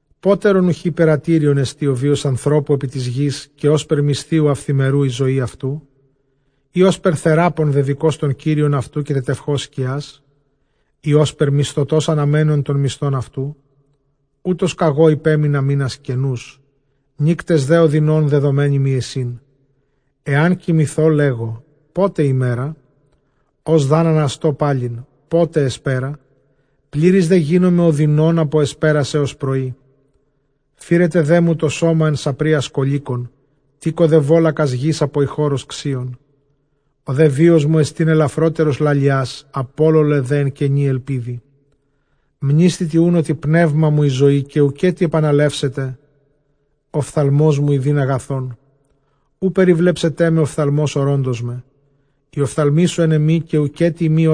Πότερον οὐχὶ πειρατήριόν ἐστιν ὁ βίος ἀνθρώπου ἐπὶ τῆς γῆς; καὶ ὥσπερ μισθίου αὐθημερινοῦ ἡ ζωὴ αὐτοῦ; Ἢ ὥσπερ θεράπων δεδοικὼς τὸν Κύριον αὐτοῦ, καὶ τετευχὼς σκιᾶς; ἢ ὥσπερ μισθωτὸς ἀναμένων τὸν μισθὸν αὐτοῦ; Οὕτως κᾀγὼ ὑπέμεινα μῆνας κενοὺς, νύκτες δὲ ὀδυνῶν δεδομέναι μοι εἰσίν. Ἐὰν κοιμηθῶ, λέγω, πότε ἡμέρα; ὡς δʼ ἂν ἀναστῶ, πάλιν, πότε ἑσπέρα; πλήρης δὲ γίνομαι ὀδυνῶν ἀπὸ ἑσπέρας ἕως πρωΐ. Φύρεται δέ μου τὸ σῶμα ἐν σαπρίᾳ σκωλήκων, τήκω δὲ βώλακας γῆς ἀπὸ ἰχῶρος ξύων. Ὁ δὲ βίος μου ἔστιν ἐλαφρότερος λαλιᾶς, ἀπόλωλε δὲ ἐν κενῇ ἐλπίδι. Μνήσθητι οὖν ὅτι πνεῦμά μου ἡ ζωὴ, καὶ οὐκ ἔτι ἐπανελεύσεται ὀφθαλμός μου ἰδεῖν ἀγαθόν. Οὐ περιβλέψεταί με ὀφθαλμὸς ὁρῶντός με, οἱ ὀφθαλμοί σου ἐν ἐμοί, καὶ οὐκ ἔτι εἰμί·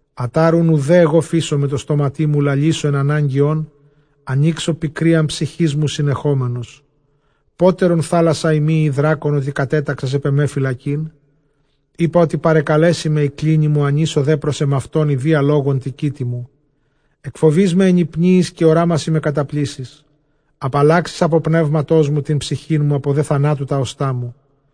Ἀτὰρ οὖν οὐδὲ ἐγὼ φείσομαι τῷ στόματί μου, λαλήσω ἐν ἀνάγκῃ ὤν, ἀνοίξω πικρίαν ψυχῆς μου συνεχόμενος. Πότερον θάλασσα εἰμὶ ἢ δράκων, ὅτι κατέταξας ἐπʼ ἐμὲ φυλακήν; Εἴπα ὅτι παρακαλέσει με ἡ κλίνη μου, ἀνοίσω δὲ πρὸς ἐμαυτὸν ἰδίᾳ λόγον τῇ κοίτῃ μου. Ἐκφοβεῖς με ἐνυπνίοις, καὶ ὁράμασί με καταπλήσσεις. Ἀπαλλάξεις ἀπὸ πνεύματός μου τὴν ψυχήν μου, ἀπὸ δὲ θανάτου τὰ ὀστᾶ μου.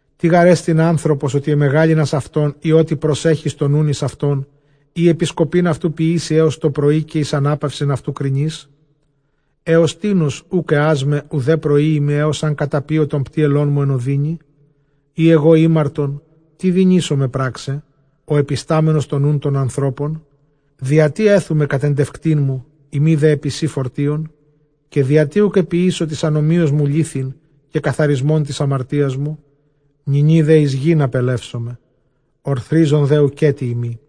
Τί γάρ ἐστιν ἄνθρωπος, ὅτι ἐμεγάλυνας αὐτόν; ἢ ὅτι προσέχεις τὸν νοῦν εἰς αὐτόν; Ἢ ἐπισκοπὴν αὐτοῦ ποιήσῃ ἕως τὸ πρωΐ; καὶ εἰς ἀνάπαυσιν αὐτὸν κρινεῖς; Ἕως τίνος οὐκ ἐᾷς με, οὐδὲ προΐῃ με, ἕως ἂν καταπίω τὸν πτύελόν μου; Εἰ ἐγὼ ἥμαρτον, τί δυνήσομαι πρᾶξαι, ὁ ἐπιστάμενος τὸν νοῦν τῶν ἀνθρώπων; διατί ἔθου με κατεντευκτήν σου, εἰμὶ δὲ ἐπὶ σοὶ φορτίον; Διατί οὐκ ἐποιήσω τῆς ἀνομίας μου λήθην, καὶ καθαρισμὸν τῆς ἁμαρτίας μου; νυνὶ δὲ εἰς γῆν ἀπελεύσομαι, ὀρθρίζων δὲ οὐκ ἔτι εἰμί.